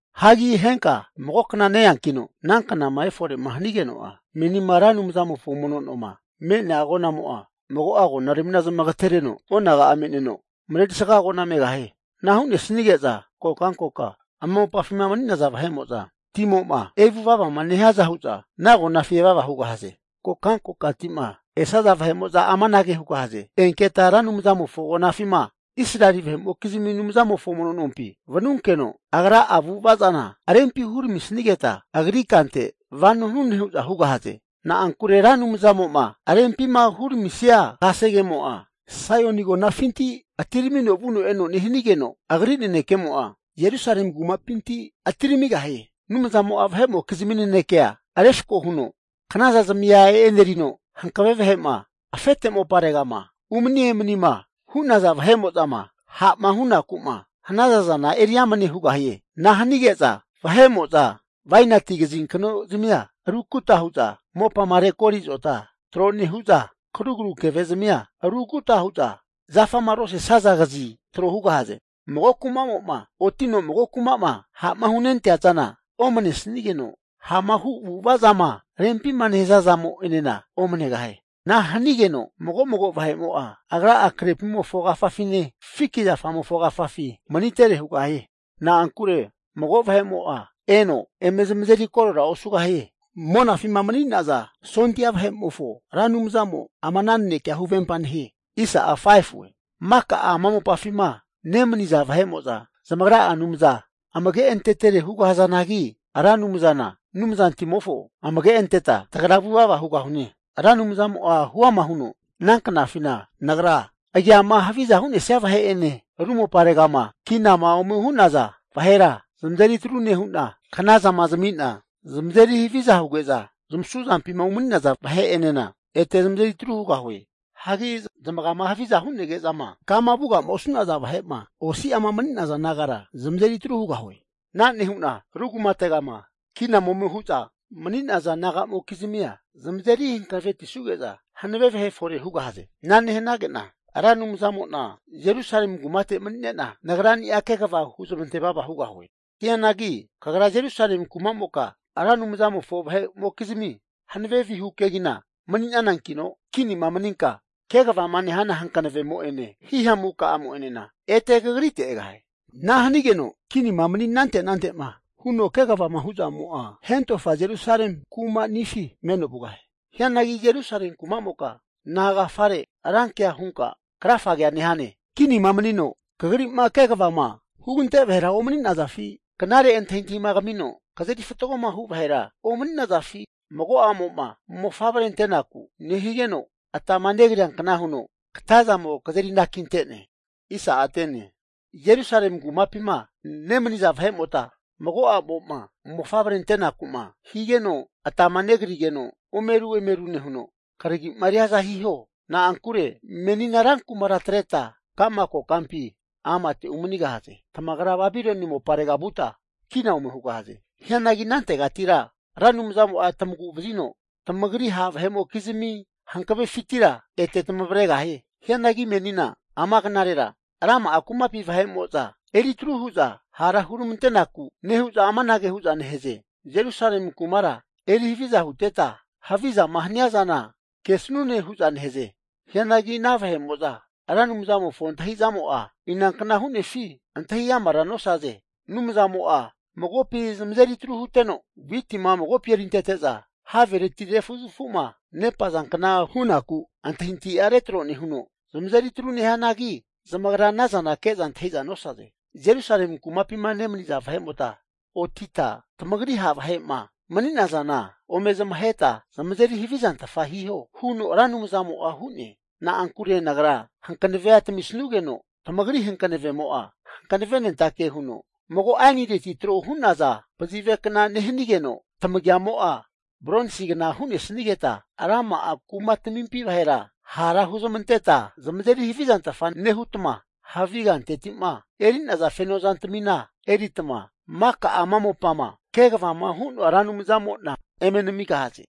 Hagi henka mago kna ne-eankino ananknama efore'ma hanigeno'a, menima Ra Anumzamofo mono noma me'nea agonamo'a mago'a agonaramina zamagatereno onaga'a me'neno, marerisa agona megahie. Ana hu'nesige'za kokankokama ama mopafima mani'naza vahe'mo'za timo'ma evuvavama nehiaza hu'za ana agonafi evava hugahaze. Kokankokati'ma esaza vahe'mo'za amanage hugahaze. Enketa Ra Anumzamofo agonafima Israeli vahe'mokizmi Anumzamofo mono nompi vanunkeno, Agra'a avu'ava zana rempi huramisigeta, Agri kante vano hanune hu'za hugahaze. Na'ankure Ra Anumzamo'ma rempima huramisia kasegemo'a Saoini agonafinti atiramino vuno eno nehanigeno, Agri nanekemo'a Jerusalemi kumapinti atiramigahie. Anumzamo'a vahe'mokizmi nenekea refko huno knaza zamia e'nerino, hankave vahe'ma afete moparegama umani emanima hu'naza vahe'mo'zama ha'ma hunaku'ma hanazana eri amne hugahie. Ana hanige'za vahe'mo'za bainati kazinkno zamia rukuta huza mopama rekori azota tro nehu'za, karugru keve zamia ruguta huza zafama rosesaza kazi tro hugahaze. Mago kumamo'ma otino mago kuma'ma ha'ma hunentea zana, omanesigeno ha'ma hu avu'ava zama rempima nehaza zamo'enena omanegahie. Ana hanigeno mago'mago vahe'mo'a agra'a krepimofo agafafine, fiki zafamofo agafafi manitere hugahie. Na'ankure mago vahe'mo'a eno eme zamazeri korora osugahie. Monafima mani'naza Sondia Vahe'mofo Ra Anumzamo ama ana nanekea huvempa nehie. Maka ama mopafima nemaniza vahe'mo'za zamagra'a anumza amage antetere hugazanagi, Ra Anumzana Anumzantimofo amage anteta tagra vuvava hugahune. Ra Anumzamo'a huama huno, Ana knafina Nagra agiama haviza hu'nesia vahe'ene, ru moparegama kinama ome hu'naza vahera zamazeri atru nehu'na, knazama zami'na zamazeri haviza huge'za zamasu zampima umani'naza vahe'enena ete zamazeri atru hugahue. Hagi zamagama havizama hunege'za kama vuga'ma osu'naza vahe'ma osi'ama mani'naza nagara zamazeri atru hugahue. Ana nehu'na ru kumategama kinama ome hu'za mani'naza nagamokizmia zamazeri hanavetisuge'za hanave vahe fore hugahaze. Ana nehanage'na Ra Anumzamo'na Jerusalemi kumate mani'nena Nagrania kegava huzmante vava hugahie. Hianagi kagra Jerusalemi kumamoka, Ra Anumzamofo vahe'mokizmi hankave vihu kegina mani'nanankino, kinima maninka kegavama nehana hankavemo'ene hihamuka'amo'enena ete kagrite egahie. Ana hanigeno kinima mani anante anante'ma huno kegavama hu'zamo'a hentofa Jerusalemi kumanifi meno vugahie. Hianagi Jerusalemi kumamoka nagafare rankea hunka krafagea nehane? Kinima manino kagri'ma kegavama hugante vahera omani'nazafi? Knare antahintahima kamino kazeri fatgoma hu vahera omani'nazafi? Hagi mago a'mo'ma mofavre ante'naku nehigeno atama negriankna huno katazamo kazeri anakinte'ne. Jerusalemi kumapima nemaniza vahe'mota, mago a'mo'ma mofavre antenaku'ma higeno atama negrigeno omeru emeru nehuno karagi'ma riaza hiho. Na'ankure menina ran kumara atreta kama kokampi amate umanigahaze. Tamagra Babiloni moparega vuta kina ome hugahaze. Hianagi anantegatira Ra Anumzamo'a tamagu'vazino, tamagri ha' vahe'mokizami hankavefintira ete tamavregahie. Hianagi menina ama knarera rama'a kumapi vahe'mo'za eri tru hu'za hara huramantenaku nehu'za amanage hu'za nehaze. Jerusalemi kumara eri haviza huteta, havizama haniazana kesanune hu'za nehaze. Hianagi ana vahe'mo'za Ra Anumzamofo antahizamo'a inankna hu'nefi antahi amara nosaze. Anumzamo'a magopi zamazeri tru huteno, witima magopi erintete'za havereti refazafuma nepazankna hunaku antahintahia retro nehuno zamazeri atru nehianagi, zamagra anazana ke'za antahi'za nosaze. Jerusalemi kumapima nemaniza vahe'mota otita tamagri ha' vahe'ma mani'nazana ome zamaheta zamazeri havizantfa hiho huno Ra Anumzamo'a hu'ne. Na'ankure Nagra hankanavea tamisanugeno, tamagri hankavemo'a hankavenentake huno mago ainireti tro hu'naza pazivekna nehanigeno, tamagiamo'a bronsigna hu'nesanigeta, rama'a kumatamimpi vahera hara huzamanteta zamazeri havizantfa nehutma, havi kanteti'ma eri'naza feno zantamina eritma, maka ama mopama kegavama hu'noa Ra Anumzamo'na eme namigahaze.